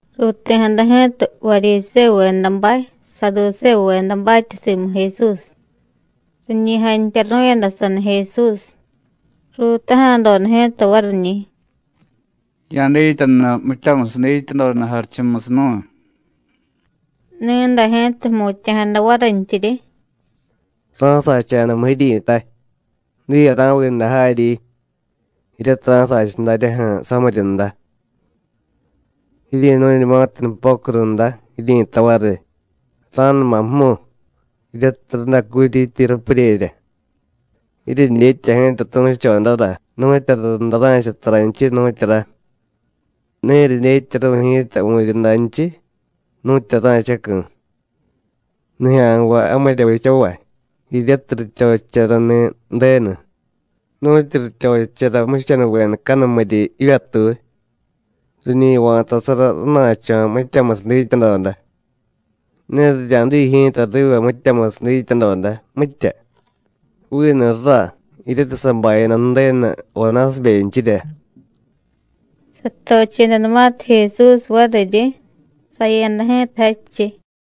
Ruuti̱jada ji̱ta Varyisévuvedabay, Saadusévuvedabatya simu Jesús, riñi jantyaru̱yada saniy Jesús. Ruutaja̱doda ji̱ta variñi̱: “Ya̱dityanura mityamusiy dityadoda jarichumusiy nu̱y.” Ni̱day ji̱ta jmutya̱jada varintyiryi: “Ra̱sacha̱damu jiryi̱tay: Diye ra̱viiday jaryi, jiryatiy ra̱sacha daryaju̱ samiryunda. Jiryi̱nu̱ñumatiy nupocu runda, jiryi̱tay variy: Ra̱numa jmu, jiryatiy radacutyityi rapuryerya. Jiryedyetya ji̱ta tu̱chodara nu̱tyura runda ra̱cha taranchiy, nu̱tyura, ne jiryedyetyaru̱y ji̱ta vu̱ryundanchiy, nu̱tyura ra̱chacu̱. Nijya̱nvay jamirya vichavay, jiryatiy rityochicharani̱ Ju̱denu, nu̱tyu rityochichara jmuchanuvedacanumiryi jivyatuy, riñi va̱tasara rana̱cho̱ mityamusiy dityadoda. Ne rirya̱diy ji̱ta riva mityamusiy dityadoda, mitya, vinu ra, jiryatiy sabayada Ju̱denu Jonásibenchirya.” Satochedanumatiy Jesús variryi, saya̱da ji̱ta jadchiy.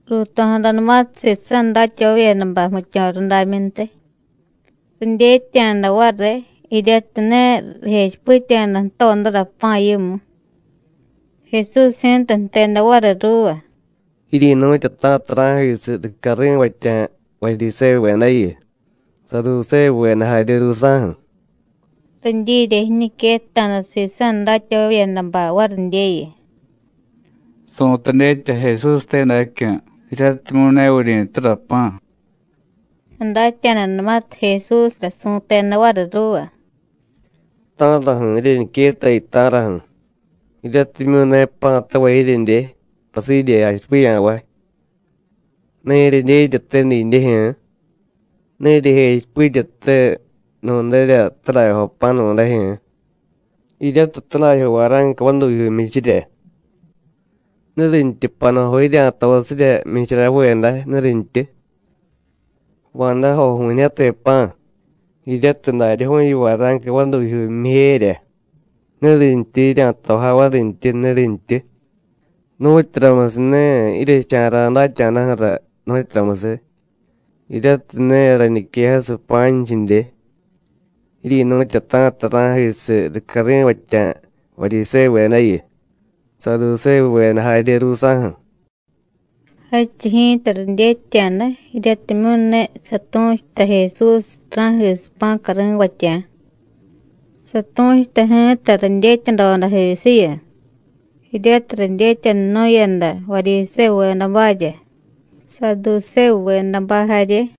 Ruuto̱jadanumatiy sisa̱ datyavavyedabay jmityo̱ rudamyuntiy, ridyetya̱da variy jiryatiy ne rijechipitya̱da jtodara pa̱ yimu. Jesús ji̱ta jteda variy ruuva: “Jiryi̱nu̱tyata̱ta ra̱jisiy ricyari̱vatya̱ Varyisévuvedayu, Saadusévuveda jarye ruusa̱ju̱.” Ridyirya jiñiquetta̱da sisa̱ datyavavyedabay varidyeyu: “Su̱tay dyetya Jesúste dacyu̱, jiryatimyu̱ ne vuryi̱tura pa̱.” Sadatya̱danumatiy Jesúsra, su̱teda variy ruuva: “¿Ta̱raju̱ jiryeñiquettayu, ta̱raju̱? ¿Jiryatimyu̱ ne pa̱tavay jiryedye, pasidye jachipiya̱vay? ¿Ne jiryedyetyate didyejyu̱ú̱? ¿Ne jiryejechipityate nu̱nrya tadajyojo pa̱ nu̱dajyu̱ú̱, jiryatiy tadajyo vara̱nca vadujyuu jmyichirya? ¿Nurintyu panujo jirya̱tosirya jmyichara jve day, nurintyu? Va̱, dajoju̱ñijyate pa̱ jiryatiy daryaju̱yu vara̱nca vadujyuu jmyijerya, ¿nurintyu jirya̱tojay varintyi, nurintyu? ¿Nu̱tyuramusiy ne jiryecha̱ra̱ datya̱daju̱ra, nu̱tyuramusiy? jiryatiy ne rañiquejasiy pa̱nchidye. Jiryi̱nu̱tyata̱ta ra̱jisiy ricyari̱vatya̱ Varyisévuvedayu, Saadusévuveda jarye ruusa̱ju̱.” Jadchiy ji̱ta ridyetya̱da jiryatimyu̱ ne satu̱chuta Jesús ra̱jisiy pa̱ cari̱vatya̱, satu̱chuta ji̱ta ridyetyadodajisiyu, jiryatiy ridyetyanunu̱yada Varyisévuvedabarya, Saadusévuvedabay jarye.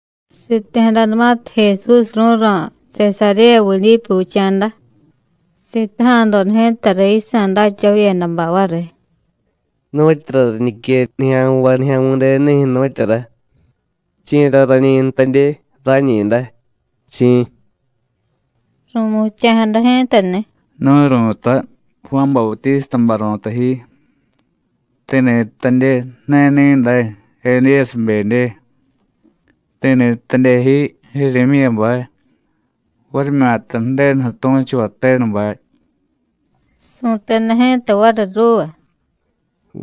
Siti̱jadanumatiy Jesús ru̱ro̱ Sesaréya Vidípu Vicha̱da, sitaja̱doda ji̱ta riy yisa̱ datyavavyedabay variy: “¿Nu̱tyura riñique nijya̱nvay Nijya̱mi̱denunijyu̱, nu̱tyura? ¿Chi̱ra rañi jtadye rañi̱day, chi̱?” Ru̱mutya̱jada ji̱tani̱: “Nu̱y ru̱tay: Juán Bautístabay ru̱tay ji. Ti̱ni̱ jtadye: Ne ni̱day, Edíyasibedye, ti̱ni̱ jtadye ji: Jiryimyíyabay, varimyata: Ju̱denuju̱ tu̱chuvay tenubay.” Su̱teda ji̱ta variy ruuva: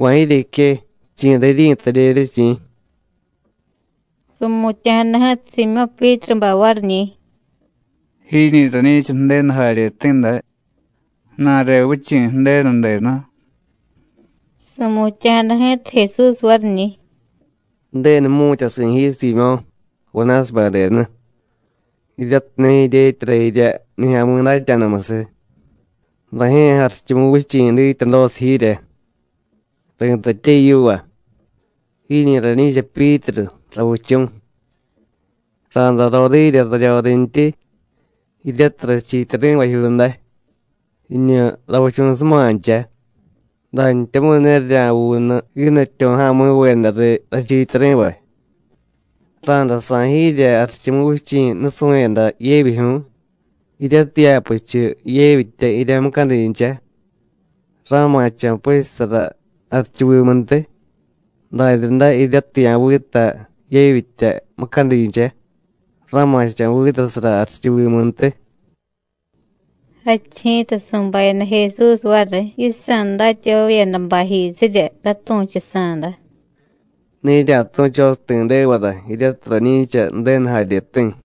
“¿Va̱ jiryeque? ¿Chi̱ra jiryi̱tadyerye, chi̱?” Su̱mutya̱jada ji̱ta Siimyó̱ Pyítrubay variñi̱: “¡Jiñi̱ rañi̱cha Ju̱denu jaryeti̱ day, ju̱na̱re vichi̱ Ju̱denu denu!” Su̱mutya̱jada ji̱ta Jesús variñi̱: “Ju̱denu jmu̱tyasi̱ ji Siimyó̱ Jonásibe denu, jiryatiy ne jidyetyara jirya nijya̱mi̱ datya̱damusiy. Rajye̱ Jarichumuvichi̱ dityadosiy jiirya. Ri̱tatye yiva: Jiñi̱ rañi̱cha Pyítru (ravichu̱). Ra̱day roriirya raryorintyi (jiryatiy rachiityari̱vajyuu day) jiñu ravichu̱sumancha, dantyamu̱y ne rirya̱vuunu jiidatyo̱ja̱mi̱veda riy rachiityari̱vay. Ra̱day sa̱y jiirya Jarichumuvichi̱ nusu̱yada yevyijyu̱y. Jiryatiy ya̱puchu yevyitya jirya mucadincha, ra̱ma̱cho̱ puchusara jarichuvimuntiy, daryaday jiryatiy ya̱vita yevyitya mucadincha, ra̱ma̱cho̱ vitasara jarichuvimuntiy.” Jadchiy ji̱ta su̱bayada Jesús variy yisa̱ datyavavyedabayjisirya ratu̱chusa̱da: “Ne jirya̱tu̱chosiy ti̱devara jiryatiy rañi̱cha Ju̱denu jaryeti̱.”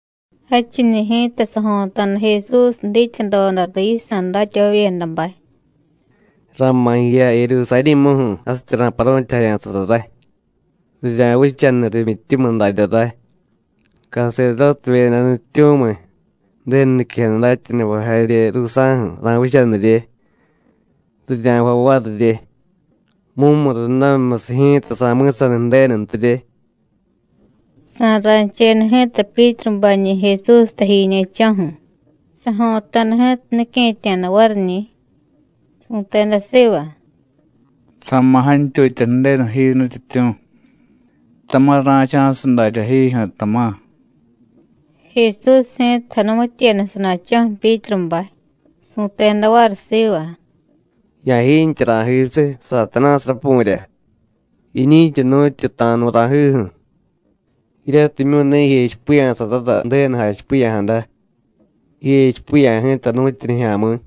Jadchiñi̱ ji̱ta sajo̱ta̱da Jesús dityadoda riy yisa̱ datyavavyedabay: “Ra̱ma̱ jiya Jerusarí̱muju̱ jasityi ra̱paru̱tyajaya̱sara ray. Rirya̱vichaniy rimyityumiy darya ray, caserdótevyeda nutyityu̱miy, Ju̱denu niquejada datyanuvay jarye ruusa̱ju̱ ra̱vichanirye. Rirya̱jvay varirye, mumurundamimyusiy ji̱ta sa̱mi̱saniy Ju̱denuntirye.” Sa̱ra̱cheda ji̱ta Pyítrubañi̱ Jesús tajiñe̱cho̱ju̱, sajo̱ta̱da ji̱ta nique̱tya̱da variñi̱. Su̱teda siva: “¡Sa̱ma̱ jantyutya Ju̱denu ji, Nutyityu̱! ¡Tama̱ ra̱cha̱siy daryá jiijyu̱, tama̱!” Jesús ji̱ta janumityeda sana̱cho̱ju̱ Pyítrubay, su̱teda variy siva: “¡Ya̱jiintye ra̱jisiy, Satanásiy rapu̱rya! Jiñi̱cha nu̱tyu ta̱a̱nu̱ ra̱jiju̱, jiryatimyu̱ ne jijechipiya̱sarara Ju̱denu jachipiya̱jada. Jijechipiya̱ ji̱ta nu̱tyu nijya̱mi̱.”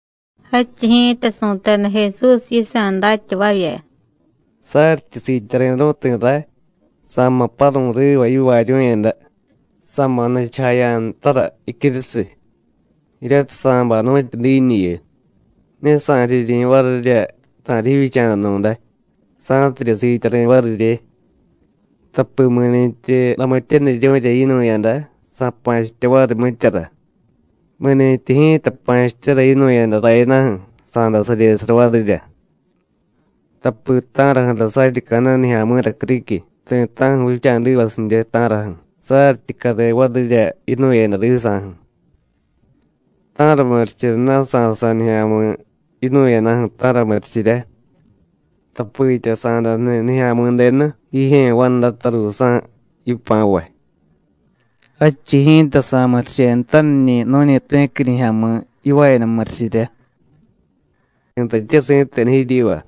Jadchiy ji̱ta su̱teda Jesús yisa̱ datyavavya: “Saryityi siityari̱ru̱y ti̱ ray, sa̱ma̱ paru̱y riva yivaaryu̱yada, sa̱ma̱ nichujaya̱ ntara jicyurusiy, jiryatiy sa̱bay nu̱tyu diiñuyu, ne sa̱riryi̱ varirya ta̱riy jivyicha̱danu̱day sa̱tidye siityari̱ varirye. Tapi mi̱ni̱tyi ramityaniryu̱rya yinu̱yada, sa̱pa̱chitya variy mityara; mi̱nintyi ji̱ta pa̱chityara yinu̱yada rayadaju̱, sa̱day saryesara varirya. Tapi ¿ta̱raju̱ra saryi ca̱na̱y nijya̱mi̱ra criquiy ti̱ta̱ju̱ vicha̱divasidye, ta̱raju̱? saryityi care varirya yinu̱yada riisa̱ju̱. ¿Ta̱ra murichiryana̱ sa̱sa̱y nijya̱mi̱ yinu̱yadaju̱, ta̱ra murichirya? Tapitya sa̱day jniy Nijya̱mi̱denu jijye̱ vandata ruusa̱ yipa̱vay, jadchiy ji̱ta sa̱murichenutaniñi̱ nu̱ñi ti̱qui nijya̱mi̱ yivaayada murichirya. Ri̱tatye si̱tenu jiryiva: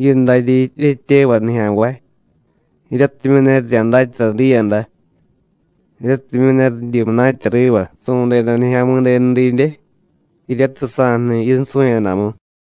Jiyu daryi jiryetyevay nijya̱nvay jiryatimyu̱ ne rirya̱datyara diiyada, netimyu̱ ne ridyi munatya riva su̱deda Nijya̱mi̱denu didye, jiryatiy sa̱jniy yinsu̱yadamu.”